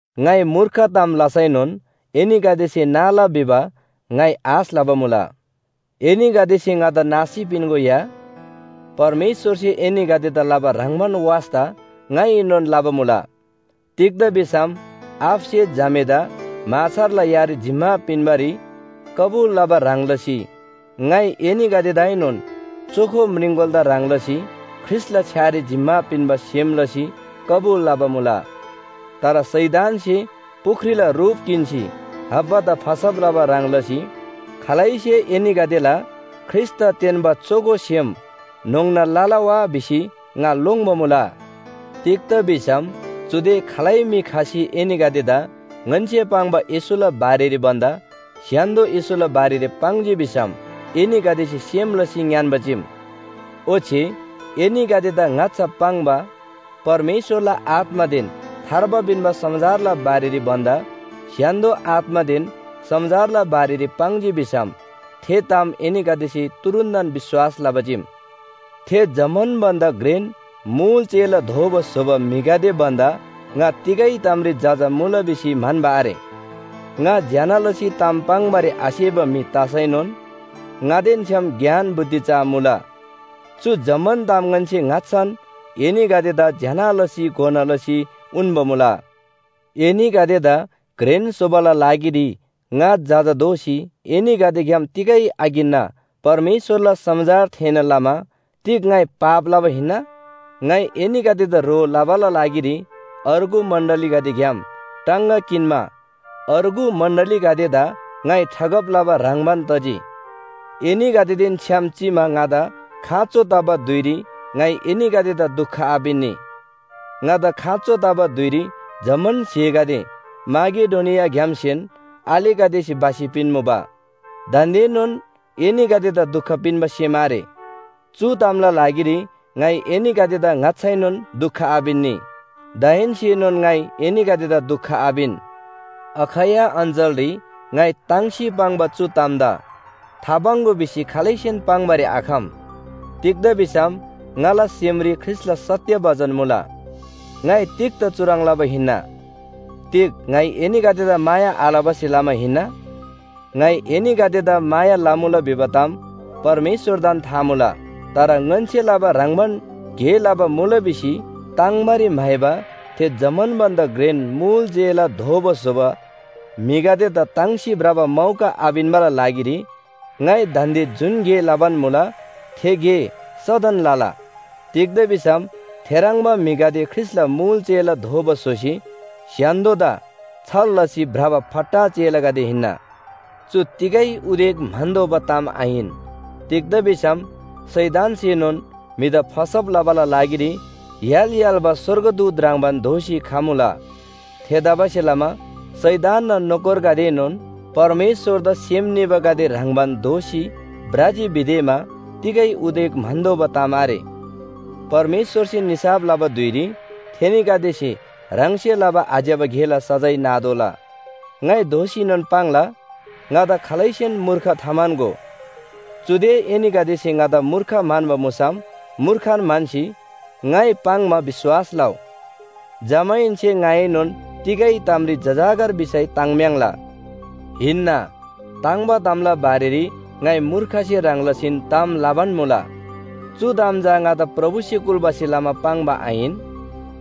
ङाइ मूर्ख ताम लसैनोन एनीगदेसे नाला भिबा ङाइ आश लबा मुला। एनीगदेसे ङादा नासी पिन्‍गो या। परमेश्‍वरसे एनीगदेदा लबा ह्रङ्‌बान वास्‍ता ङाइएनोन लबा मुला। तिग्‍दा भिसम आबासे झामेदा म्‍हाछारला यारी जिम्‍मा पिन्‍बारी कबुल लबा ह्रङ् लसी ङाइ एनीगदेदाएनोन चोखो म्रिङकोलादा ह्रङ् लसी ख्रीष्‍टला छ्‌यारी जिम्‍मा पिन्‍बा सेम लसी कबुल लबा मुला। तर शैतानसे पुख्रीला रुप किन्‍सी हव्वादा फसब लबा ह्रङ् लसी खालैसे एनीगदेला ख्रीष्‍टदा तेन्‍बा चोखो सेम न्‍होङ्ना लला वा भिसी ङा लोङ्‌बा मुला। तिग्‍दा भिसम चुदे खालै म्‍हि खसी एनीगदेदा ङन्‍से पाङ्बा येशूला बारेरी भन्‍दा स्‍य्‍हान्‍दो येशूला बारेरी पाङ्जी भिसम एनीगदेसे सेम लसी ङ्‌यान्‍बा चीम। ओच्‍छे एनीगदेदा ङाच्‍छा पाङ्बा परमेश्‍वरला आत्‍मादेन थार्बा पिन्‍बा समाचारला बारेरी भन्‍दा स्‍य्‍हान्‍दो आत्‍मादेन समाचारला बारेरी पाङ्जी भिसम थे ताम एनीगदेसे तुरुन्‍तन विश्‍वास लबा चीम। थे जम्‍मान भन्‍दा घ्रेन मुल चेला दोबा स्‍होबा म्‍हिगदे भन्‍दा ङा तिगै तामरी जजा मुला भिसी म्‍हन्‍बा आरे। ङा ज्‍यना लसी ताम पाङ्‌बारी आसेबा म्‍हि तसैनोन ङादेन छ्‌याम ज्ञान बुद्धि चा मुला। चु जम्‍मान ताम ङन्‍से ङाच्‍छान एनीगदेदा ज्‍यना लसी घोना लसी उन्‍बा मुला। एनीगदेदा घ्रेन स्‍होबाला लागिरी ङा जजा दोसी एनीगदेग्‍याम तिगै आकिन्‍ना परमेश्‍वरला समाचार थेःना लमा तिग ङाइ पाप लबा हिन्‍ना? ङाइ एनीगदेदा ह्रो लबाला लागिरी अर्गु मण्‍डलीगदेग्‍याम टाङगा किन्‍मा अर्गु मण्‍डलीगदेदा ङाइ ठगब लबा ह्रङ्‌बान तजी। एनीगदेदेन छ्‌याम चिमा ङादा खाँचो तबा धुइरी ङाइ एनीगदेदा दुख आपिन्‍नी। ङादा खाँचो तबा धुइरी जम्‍मान स्‍हेगदे माकेडोनियाग्‍यामसेन आलेगदेसे भसी पिन्‍मुबा। दान्‍देनोन एनीगदेदा दुख पिन्‍बा सेम आरे। चु तामला लागिरी ङाइ एनीगदेदा ङाच्‍छाएनोन दुख आपिन्‍नी, दाहेन्‍सेनोन ङाइ एनीगदेदा दुख आपिन। अखैया अञ्‍चलरी ङाइ ताङ्सी पाङ्बा चु तामदा थापाङ्‍गो भिसी खालैसेन पाङ्‌बारी आखम। तिग्‍दा भिसम ङाला सेमरी ख्रीष्‍टला सत्‍य बचन मुला। ङाइ तिग्‍दा चुह्रङ् लबा हिन्‍ना? तिग ङाइ एनीगदेदा माया आलबासे लमा हिन्‍ना? ङाइ एनीगदेदा माया लमुला भिबा ताम परमेश्‍वरदान था मुला। तर ङन्‍से लबा ह्रङ्‌बान गे लबा मुला भिसी ताङ्बारी म्‍हाइबा थे जम्‍मान भन्‍दा घ्रेन मुल चेला दोबा स्‍होबा म्‍हिगदेदा ताङ्सी भ्रबा मौका आपिन्‍बाला लागिरी ङाइ दान्‍दे जुन गे लबान मुला थे गे सदन लला। तिग्‍दा भिसम थेह्रङ्बा म्‍हिगदे ख्रीष्‍टला मुल चेला दोबा स्‍होसी स्‍य्‍हान्‍दोदा छल लसी भ्रबा फट्टा चेलागदे हिन्‍ना। चु तिगै उदेक म्‍हन्‍तोःबा ताम आहिन। तिग्‍दा भिसम शैतानसेनोन म्‍हिदा फसब लबाला लागिरी य्‍हाल य्‍हाल्‍बा स्‍वर्गदूत ह्रङ्‌बान दोसी खमुला। थेतबासेलमा शैतानना नोकरगदेएनोन परमेश्‍वरदा सेम निबागदे ह्रङ्‌बान दोसी भ्रजी भिदेमा तिगै उदेक म्‍हन्‍तोःबा ताम आरे। परमेश्‍वरसे निसाफ लबा धुइरी थेनीगदेसे ह्राङसे लबा आज्‍यबा गेला सजाय नातोःला। ङाइ दोःसीनोन पाङ्ला, ङादा खालैसेन मूर्ख थाम्‍हन्‍गो। चुदे एनीगदेसे ङादा मूर्ख म्‍हन्‍बा मुसम मूर्खन म्‍हन्‍सी ङाइ पाङ्‌मा विश्‍वास लउ। जमाहेन्‍से ङाइएनोन तिगै तामरी जजाकर भिसै ताङ्म्‍याङ्ला। हिन्‍ना, ताङ्‍बा तामला बारेरी ङाइ मूर्खसे ह्रङ् लसीन ताम लबान मुला। चु ताम चा ङादा प्रभुसे कुल्‍बासे लमा पाङ्बा आहिन।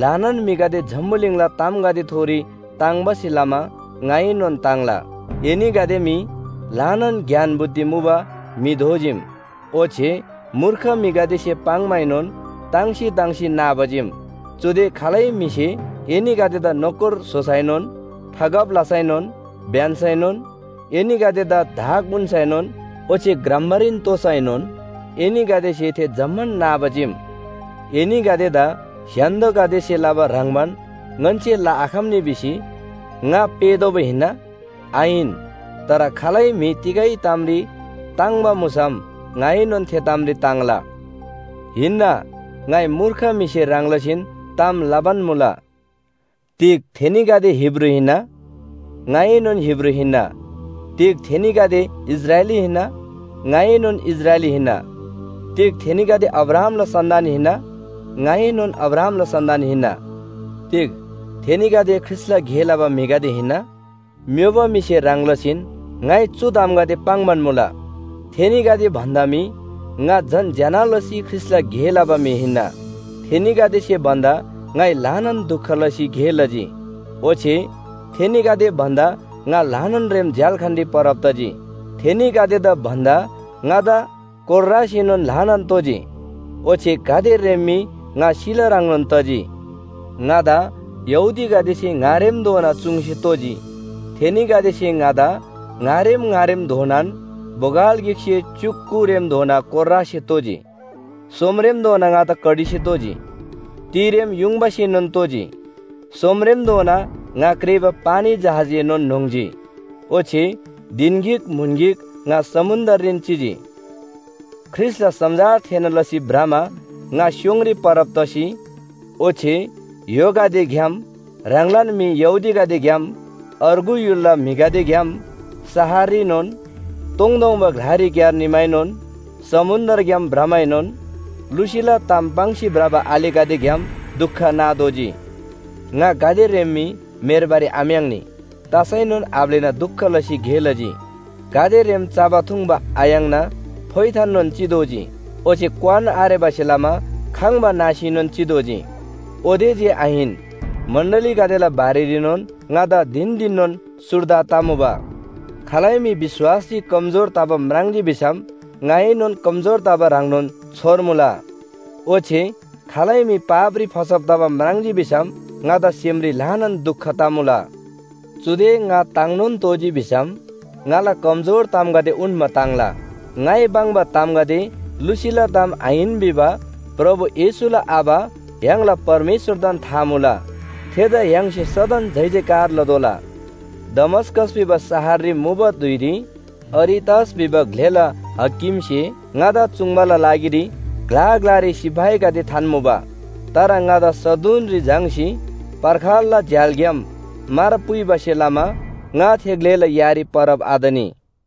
ल्‍हानान म्‍हिगदे जम्‍बुलिङला तामगदेथोरी ताङ्बासे लमा ङाइएनोन ताङ्ला। एनीगदे मी ल्‍हानान ज्ञान बुद्धि मुबा म्‍हि दोजीम। ओच्‍छे मूर्ख म्‍हिगदेसे पाङ्‌माएनोन ताङ्सी ताङ्सी नाबा चीम। चुदे खालै म्‍हिसे एनीगदेदा नोकर स्‍होसैनोन, ठगब लसैनोन, ब्‍यन्‍सैनोन, एनीगदेदा धाक उन्‍सैनोन ओच्‍छे ग्रम्‍बारीन तोसैनोन एनीगदेसे थे जम्‍मान नाबा चीम। एनीगदेदा स्‍य्‍हान्‍दोगदेसे लबा ह्रङ्‌बान ङन्‍से लआखम्‍नी भिसी ङा पेःतोःबा हिन्‍ना? आहिन। तर खालै म्‍हि तिगै तामरी ताङ्‍बा मुसम ङाइएनोन थे तामरी ताङ्ला। हिन्‍ना, ङाइ मूर्ख म्‍हिसे ह्रङ् लसीन ताम लबान मुला। तिग थेनीगदे हिब्रू हिन्‍ना? ङाएनोन हिब्रू हिन्‍ना। तिग थेनीगदे इस्राएली हिन्‍ना? ङाएनोन इस्राएली हिन्‍ना। तिग थेनीगदे अब्राहामला सन्‍तान हिन्‍ना? ङाएनोन अब्राहामला सन्‍तान हिन्‍ना। तिग थेनीगदे ख्रीष्‍टला गे लबा म्‍हिगदे हिन्‍ना? म्‍योबा म्‍हिसे ह्रङ् लसीन ङाइ चु तामगदे पाङ्‌बान मुला। थेनीगदे भन्‍दा मी ङा झन ज्‍यना लसी ख्रीष्‍टला गे लबा म्‍हि हिन्‍ना। थेनीगदेसे भन्‍दा ङाइ ल्‍हानान दुख लसी गे लजी। ओच्‍छे थेनीगदे भन्‍दा ङा ल्‍हानान रेम झ्‍याल्‍खानरी परब तजी। थेनीगदेदा भन्‍दा ङादा कोर्रासेनोन ल्‍हानान तोजी। ओच्‍छे गाते रेम मी ङा सिला ह्रङ्नोन तजी। ङादा यहूदीगदेसे ङारेमधोना चुङ्सी तोजी। थेनीगदेसे ङादा ङारेम ङारेमधोनान बोगल गिकसे च्‍युक कुरेमधोना कोर्रासे तोजी। सोमरेमधोना ङादा कडीसे तोजी। तिरेम युङबासेनोन तोजी। सोमरेमधोना ङा क्रेःबा पानी जहाजएनोन न्‍होङ्जी। ओच्‍छे धिन गिक म्‍हुन गिक ङा समुन्‍द्ररीन चिजी। ख्रीष्‍टला समाचार थेःना लसी भ्रमा ङा स्‍योङरी परब तसी, ओच्‍छे य्‍होगदेग्‍याम, ह्राङलान म्‍हि यहूदीगदेग्‍याम, अर्गु य्‍हुलला म्‍हिगदेग्‍याम, शहररीनोन, तोङतोङबा ग्‍लारीक्‍यार निमाएनोन, समुन्‍द्रग्‍याम भ्रमाएनोन, लुसीला ताम पाङ्सी भ्रबा आलेगदेग्‍याम दुख नातोःजी। ङा गाते रेम मी म्‍हेर्बारी आम्‍याङ्नी तसैनोन आब्‍लेना दुख लसी गे लजी, गाते रेम चबा थुङ्बा आयाङ्ना फोइथाननोन चितोःजी ओच्‍छे क्‍वान आरेबासे लमा खङ्‍बा नासीनोन चितोःजी। ओते जे आहिन, मण्‍डलीगदेला बारेरीनोन ङादा धिन धिननोन सुर्दा तमुबा। खालै म्‍हि विश्‍वासरी कमजोर तबा म्राङ्जी भिसम ङाएनोन कमजोर तबा ह्रङ्नोन छोर्मुला, ओच्‍छे खालै म्‍हि पापरी फसब तबा म्राङ्जी भिसम ङादा सेमरी ल्‍हानान दुख तमुला। चुदे ङा ताङ्‌नोन तोःजी भिसम ङाला कमजोर तामगदे उन्‍मा ताङ्ला। ङाइ पाङ्बा तामगदे लुसीला ताम आहिन भिबा प्रभु येशूला आबा य्‍हाङला परमेश्‍वरदान था मुला। थेदा य्‍हाङसे सदन जयजयकार लतोःला। दमस्‍कस भिबा शहररी मुबा धुइरी अरितस भिबा ग्‍लेला हाकिमसे ङादा चुङ्बाला लागिरी ग्‍ला ग्‍लारी सिपाहीगदे थान्‍मुबा। तर ङादा सदुनरी झाङ्‌सी पर्खालला झ्‍यालग्‍याम मार पुइबासे लमा ङा थे ग्‍लेला यारी परब आतनी।